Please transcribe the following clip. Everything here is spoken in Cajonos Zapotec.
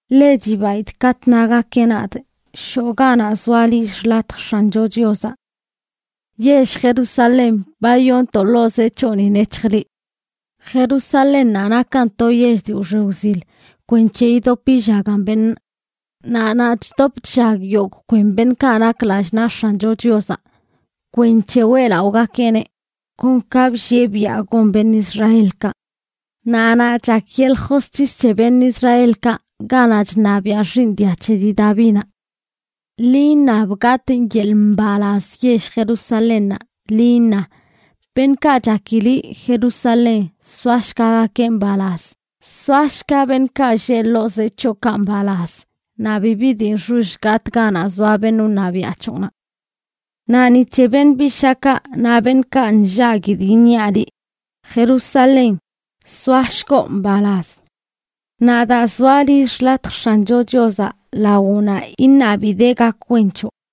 Ḻe chibaidꞌ katꞌ nagakeꞌ nadꞌ: “Shoꞌ ganaꞌ zoa lill xḻatj X̱ancho Chiozaꞌ.” Yell Jerusalén, ba yoontoꞌ ḻoo zee c̱hoꞌni, nec̱hj liꞌ. Jerusalénnaꞌ nakan to yell dii wxe wzil kwenc̱he yidop yillagan beṉꞌ. Naꞌ naꞌ chdop chllag yogꞌ kwen beṉꞌkaꞌ nak lallꞌ naꞌ X̱ancho Chiozaꞌ kwenc̱he weꞌlaꞌogakeꞌneꞌ kon ka bllieꞌ biaꞌ gon beṉꞌ Israelkaꞌ. Naꞌ naꞌ chak yeḻꞌ josc̱his c̱he beṉꞌ Israelkaꞌ, ganaꞌ chṉabiaꞌ xiiṉ dia c̱he dii Davinaꞌ. Ḻi iṉab gatꞌ yeḻꞌ mbalaz yell Jerusalénnaꞌ, ḻi iṉa: “Beṉꞌkaꞌ chaki liꞌ, Jerusalén, soashgagakeꞌ mbalaz. Soashga beṉꞌkaꞌ lleꞌ ḻoo zee c̱hoꞌkaꞌ mbalaz; naꞌ bibi dii nxoll gatꞌ ganaꞌ zoa beṉꞌ wṉabiaꞌ c̱hoꞌnaꞌ.” Naꞌ ni c̱he beṉꞌ bishaakaꞌ naꞌ beṉꞌkaꞌ nllaguidꞌ iṉiaꞌ liꞌ, Jerusalén: “Soashgoꞌ mbalaz.” Naꞌ daa zoa lill xḻatj X̱ancho Chiozaꞌ lawoꞌnaꞌ iṉabidee gak wen c̱hoꞌ.